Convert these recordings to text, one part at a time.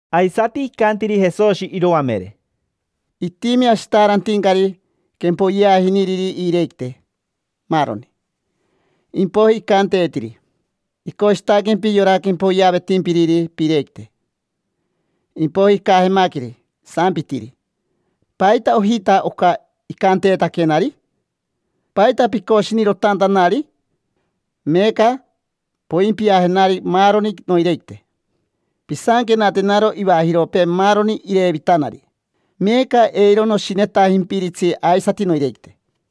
Aisati icantiri Jesoshi iroamere: —Itimi ashitaarantincari quempoyeajiniriri iirequite, maaroni. Impoiji icanteetiri: “Icoshitaquempi yora quempoyeavetimpiriri piirequite”. Impoiji icajemaqueri, isampitiri: “¿Paita ojita oca icanteetaquenari? ¿Paita picoshinirotantanari? Meeca poimpiajenari maaroni noirequite, pisanquenatenaro ivajiropee maaroni irevitanari. Meeca eiro noshinetajimpiritsi aisati noirequite”.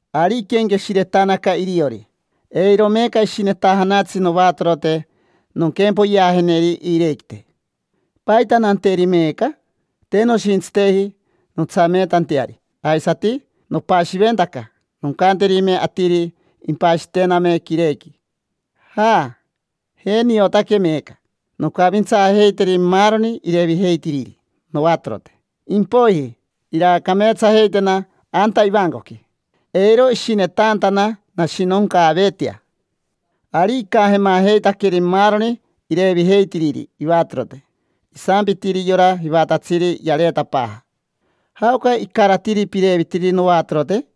Ari iquenqueshiretanaca iriori: “Eiro meeca ishinetajanatsi novatorote nonquempoyeajeneri iirequite. ¿Paita nanteri meeca? Te noshintsiteji nontsameetanteari. Aisati nopashiventaca noncanterime atiri impashitename quirequi. Ja, je niotaque meeca. Noncavintsaajeiteri maaroni irevijeitiriri novatorote. Impoiji, iraacameetsajeitena anta ivancoqui: eiro ishinetantana nashinoncaaveetea”. Ari icajemajeitaqueri maaroni irevijeitiriri ivatorote. Isampitiri yora jivatatsiri yareetapaaja: “¿Jaoca icaratiri pirevitiri novatorote?”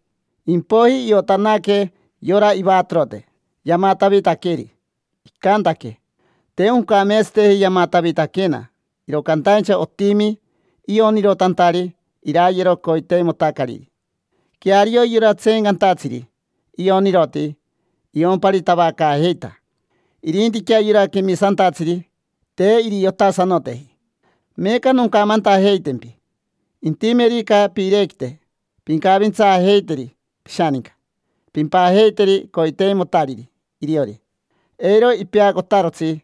Impoiji iotanaque yora ivatorote yamatavitaqueri. Icantaque: “Te oncameetsateji yamatavitaquena, iro cantaincha otimi ionirotantari irayero coiteimotacariri”. Queario yora tseencantatsiri ioniroti iomparitavacaajeita. Irintiquea yora quemisantatsiri te iriotasanoteji. Meeca noncamantajeitempi: intimerica piirequite, pincavintsaajeiteri pishaninca, pimpajeiteri coiteimotariri iriori. Eiro ipeacotarotsi.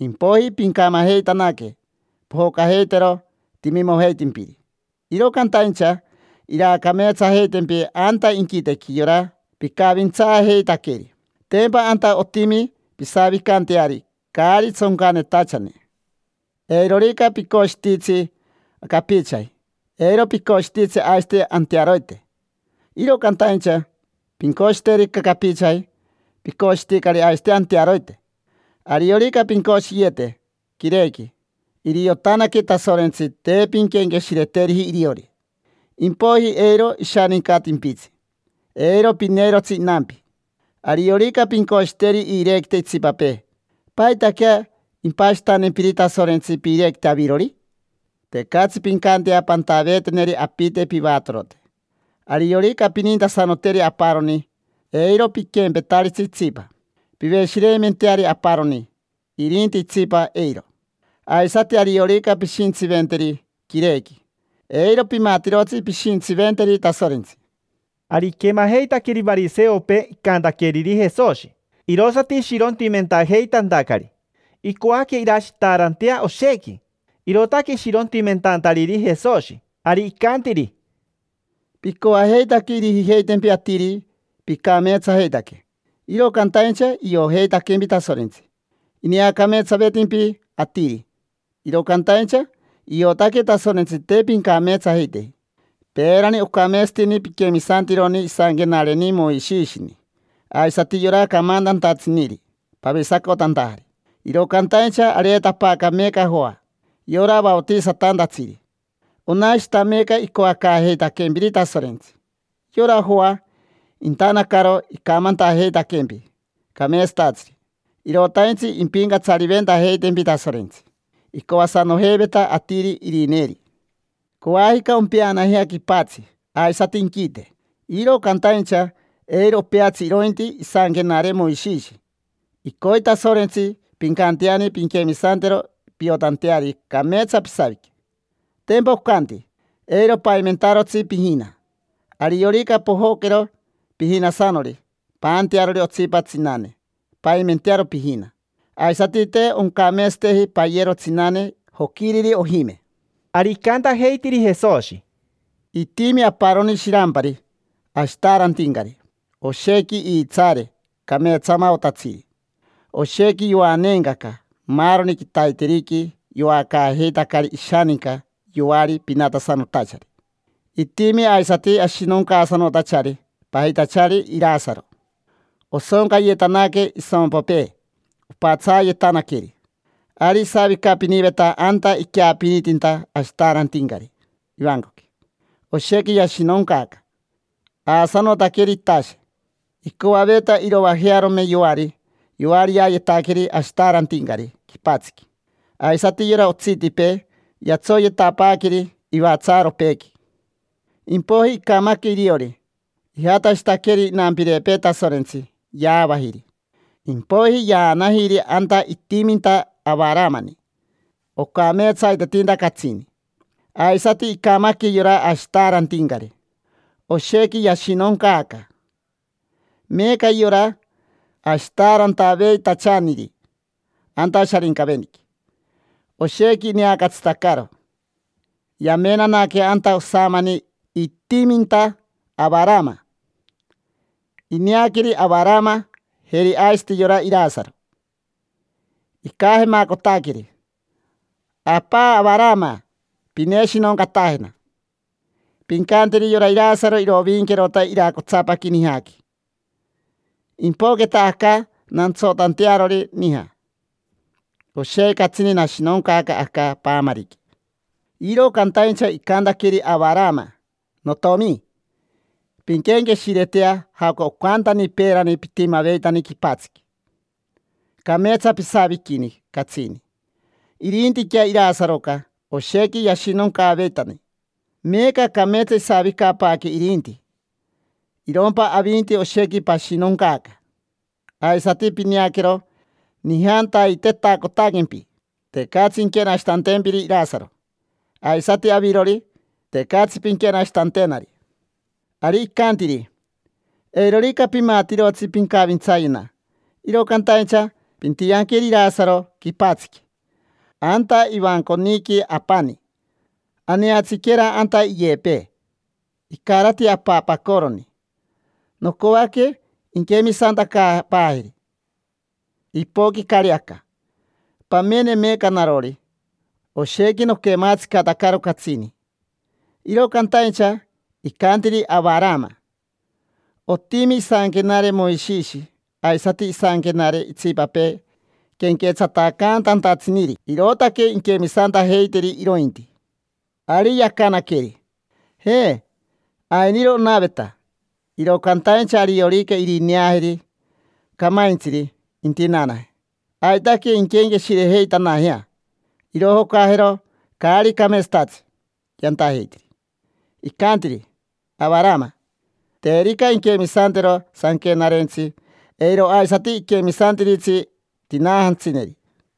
Impoiji pincamajeitanaque, pojocajeitero timimojeitimpiri, iro cantaincha iraacameetsajeitempi anta inquitequi yora picavintsaajeitaqueri. Tempa anta otimi pisavicanteari caari tsoncanetachane. Eirorica picoshititsi capichaji, eiro picoshititsi aisati antearoite. Iro cantaincha pincoshiterica capichaji, picoshiticari aisati antearoite. Ariorica pincoshiyete quirequi, iriotanaque Tasorentsi te pinquenqueshireteriji iriori: impoiji eiro ishanincatimpitsi, eiro pineirotsi inampi. Ariorica pincoshiteri iirequite itsipapee, ¿paitaquea impashitantempiri Tasorentsi piirequite avirori? Tecatsi pincantea pantaveeteneri apite pivatorote. Ariorica pinintasanoteri aparoni, eiro piquempetaritsi itsipa. Piveshireimenteari aparoni, irinti itsipa, eiro. Aisati ariorica pishintsiventeri quirequi, eiro pimatirotsi pishintsiventeri Tasorentsi. Ari iquemajeitaqueri variseopee icantaqueriri Jesoshi, irosati ishirontimentajeitantacari. Icoaque irashitaarantea oshequi, irootaque ishirontimentantariri Jesoshi. Ari icantiri: —Picoajeitaque irijijeitempi atiri picameetsajeitaque, iro cantaincha iojeitaquempi Tasorentsi. Ineacameetsavetimpi atiri, iro cantaincha iotaque Tasorentsi te pincameetsajeiteji. Peerani ocameetsatini piquemisantironi isanquenareni Moishishini aisati yora camantantatsiniri pavisacotantajari. Iro cantaincha areetapaaca meeca Joa, yora vaotisatantatsiri. Onashita meeca icoacaajeitaquempiri Tasorentsi. Yora Joa intanacaro icamantajeitaquempi cameetsatatsiri: irotaintsi impincatsariventajeitempi Tasorentsi. Icoasanojeiveta atiri irineeri. Coajica ompeanajea quipatsi aisati inquite, iro cantaincha eiro opeatsi irointi isanquenare Moishishi: icoi Tasorentsi pincanteani pinquemisantero piotanteari cameetsa pisavique. Tempa ocanti: “Eiro paimentarotsi pijina”. Ariorica pojoquero pijinasanori paantearori otsipa tsinane, paimentearo pijina. Aisati te oncameetsateji payero tsinane joquiriri ojime. Ari icantajeitiri Jesoshi: —Itimi aparoni shirampari ashitaarantincari, oshequi iitsaare cameetsamaotatsiri, oshequi yoaneencaca. Maaroni quitaiteriqui yoacaajeitacari ishaninca yoari pinatasanotachari. Itimi aisati ashinoncaasanotachari pajitachari Irasaro. Osoncayetanaque isompopee opatsaayetanaqueri. Ari isavicapiniveta anta iqueapinitinta ashitaarantincari ivancoqui. Oshequi yashinoncaaca, aasanotaqueri itashe. Icoaveta iroajearome yoari yoariayetaqueri ashitaarantincari quipatsiqui. Aisati yora otsitipee yatsoyetapaaqueri ivatsaaropeequi. Impoiji icamaque iriori. Ijatashitaqueri inampirepee Tasorentsi, yaavajiri, impoiji yaanajiri anta itiminta Avaramani. Ocameetsaitetinta catsini. Aisati icamaque yora ashitaarantincari. Oshequi yashinoncaaca meeca yora ashitaarantaveitachaniri anta Sharincaveniqui, oshequi ineacatsitacaro. Yamenanaque anta osamani itiminta Avarama. Ineaqueri Avarama, jeri aisati yora Irasaro. Icajemacotaqueri: “Apa Avarama, pineshinoncatajena. Pincanteri yora Irasaro irovinquerota iracotsapaqui nijaqui, impoqueta aca nantsotantearori nija. Oshequi catsini nashinoncaaca aca paamariqui”. Iro cantaincha icantaqueri Avarama: “Notiomi, pinquenqueshiretea jaoca ocantani peerani pitimaveitani quipatsiqui. Cameetsa pisaviquini catsini, irintiquea Irasaroca oshequi yashinoncaaveitani. Meeca cameetsa isavicapaaque irinti, irompa avinti oshequi pashinoncaaca. Aisati pineaquero nijantaitetacotaquempi, tecatsi inquenashitantempiri Irasaro. Aisati avirori, tecatsi pinquenashitantenari”. Ari icantiri: “Eirorica pimatirotsi pincavintsayena. Iro cantaincha pintianqueri Irasaro quipatsiqui: anta ivanconiqui apani. Aneatsiquera anta iyepee, icarati apapacoroni. Nocoaque inquemisantacaapaajeri, ipoquicari aca. Pamene meeca narori, oshequi noquematsicatacaro catsini”. Iro cantaincha icantiri Avarama: “Otimi isanquenare Moishishi aisati isanquenare itsipapee quenquetsatacantantatsiniri. Irootaque inquemisantajeiteri irointi”. Ari yacanaqueri: “Je, ainiro onaveta. Iro cantaincha ariorica irineajeri camaintsiri intinaanaje, aitaque inquenqueshirejeitanajea, irojocajero caari cameetsatatsi yantajeitiri”. Icantiri Avarama: “Terica inquemisantero sanquenarentsi, eiro aisati iquemisantiritsi tinaajantsineri”.